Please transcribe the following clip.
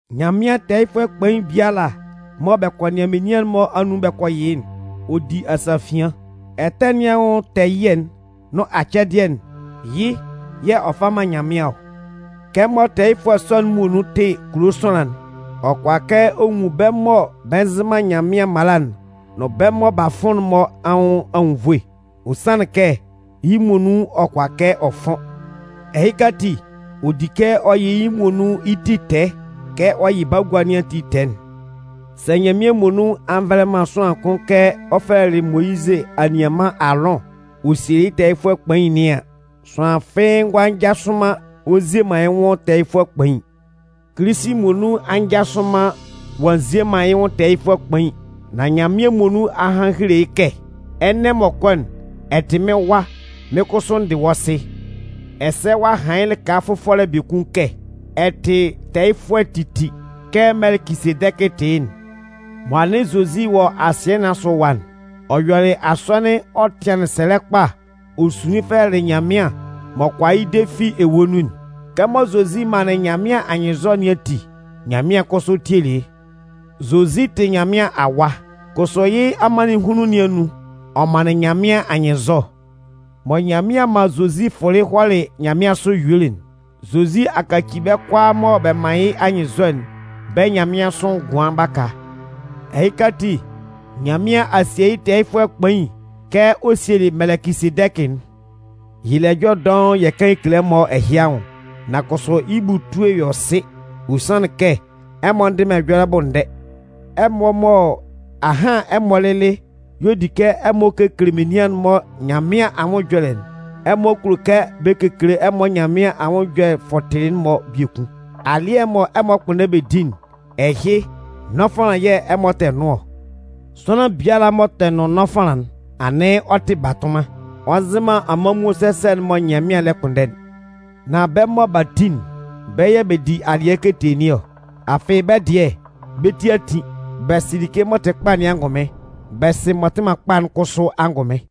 Nyanmɩan tɛɛyɩfʋɛ kpain biala mɔ bɛ kɔ nɩan menian'n-mɔ anun bɛ kɔ yɩ yɩ́'n, ɔ di asafian. Ɛtɛ nɩn anwʋn tɛɛ ɛyɩɛ'n nʋn acɛdɩɛ'n, yɩ́ yɛ̂ ɔ fa man Nyanmɩan ɔ. Kɛmɔ tɛɛyɩfʋɛ sɔ'n muonun tɩ kulo sʋanlan'n, ɔ kʋala kɛ ɔ nwun bɛ́ mɔ bɛ nzɩ man Nyanmɩan mala'n nʋn bɛ́ mɔ b'a fʋn'n-mɔ anwʋn anwunnvoe. Ɔ sanlɩn kɛ, yɩ́ muonun ɔ kʋala kɛ ɔ fʋn. Ɛhɩka ati, ɔ di kɛ ɔ yɩ yɩ́ muonun yɩ́ ti tɛɛ kɛ ɔ yɩ bagua nɩn ati tɛɛ'n. Sɛ Nyanmɩan muonun a nvɛlɛ man sʋanlan kʋn kɛ ɔ fɛlɛlɩ Moyizɩ anianman Aalʋn ɔ sielɩ yɩ́ tɛɛyɩfʋɛ kpain nɩn an, sʋanlan fɩ́ɩ́ ngʋala njasʋ man ɔ nzie man yɩ́ nwʋn tɛɛyɩfʋɛ kpain. Kilisi muonun a njasʋ man ɔ'a nzie man yɩ́ nwʋn tɛɛyɩfʋɛ kpain. Nan Nyanmɩan muonun a han a hele yɩ́ kɛ: Ɛnɛ m'ɔ kɔ'n, ɛ tɩ mɩ́n Wa, mɩ́n kʋsʋ n dɩ wɔ́ Sɩ. Ɛsɛ ɔ'a han yɩ́ lɩka fʋfɔlɛ biekun kɛ: Ɛ tɩ tɛɛyɩfʋɛ titi kɛ Mɛlɛkɩsedɛkɩ tɩ yɩ́'n. Mɔ anɩn Zozi wɔ asɩɛ nɩn asʋ ɛwa'n, ɔ yɔlɩ asɔnɩn ɔ tɩanlɩn sɛlɛ kpa ɔ sunlin fɛlɛlɩ Nyanmɩan m'ɔ kʋala yɩ́ de fi ewue nun'n. Kɛmɔ Zozi manlɩn Nyanmɩan anyɩnnzɔ nɩn ati, Nyanmɩan kʋsʋ tielɩ yɩ́. Zozi tɩ Nyanmɩan Awa, kʋsʋ yɩ́ amannɩnhunlun nɩn anun, ɔ manlɩn Nyanmɩan anyɩnnzɔ. Mɔ Nyanmɩan man Zozi fʋlɩ hɔlɩ nyanmɩansʋ yuelɩ'n, Zozi a kaci bɛ́ kʋalaa mɔ bɛ man yɩ́ anyɩnnzɔ'n, bɛ́ nyanmɩansʋ ngʋan baka. Ɛhɩka ati, Nyanmɩan a sie yɩ́ tɛɛyɩfʋɛ kpain kɛ ɔ sielɩ Mɛlɛkɩsedɛkɩ'n. Yɛ le ɛjɔlɛ dɔʋn yɛ kan yɛ kele ɛmɔ ɛhɩ anwʋn, nan kʋsʋ, yɩ́ bʋ etue yɔ sɩ. Ɔ sanlɩn kɛ ɛmɔ ndɩ man ɛjɔlɛ bʋ ndɛ. Ɛmɔ mɔ ahan ɛmɔ lɩlɩ y'ɔ di kɛ ɛmɔ kekele menian'n-mɔ Nyanmɩan anwʋn ɛjɔlɛ'n, ɛmɔ kulo kɛ bɛ kekele ɛmɔ Nyanmɩan anwʋn ɛjɔlɛ fɔtɩlɩ'n-mɔ biekun. Alɩɛ mɔ ɛmɔ 'kpʋnndɛ bɛ di'n, ɛhɩ nɔfanlan yɛ̂ ɛmɔ tɛ nʋn ɔ. Sʋanlan biala m'ɔ tɛ nʋn nɔfanlan'n, anɩn ɔ tɩ batʋnman. Ɔ nzɩ man amanmuo sɛsɛ'n mɔ Nyanmɩan lɛ kpʋnndɛ'n. Nan bɛ́ mɔ b'a tin'n, bɛ́ yɛ̂ bɛ di alɩɛ ketee nɩn ɔ, afɩ bɛ́ dɩɛ bɛ́ ti a tin. Bɛ sɩ like m'ɔ tɩ kpa nɩn angʋnmɩn. Bɛ sɩ m'ɔ tɩ man kpa'n kʋsʋ angʋnmɩn.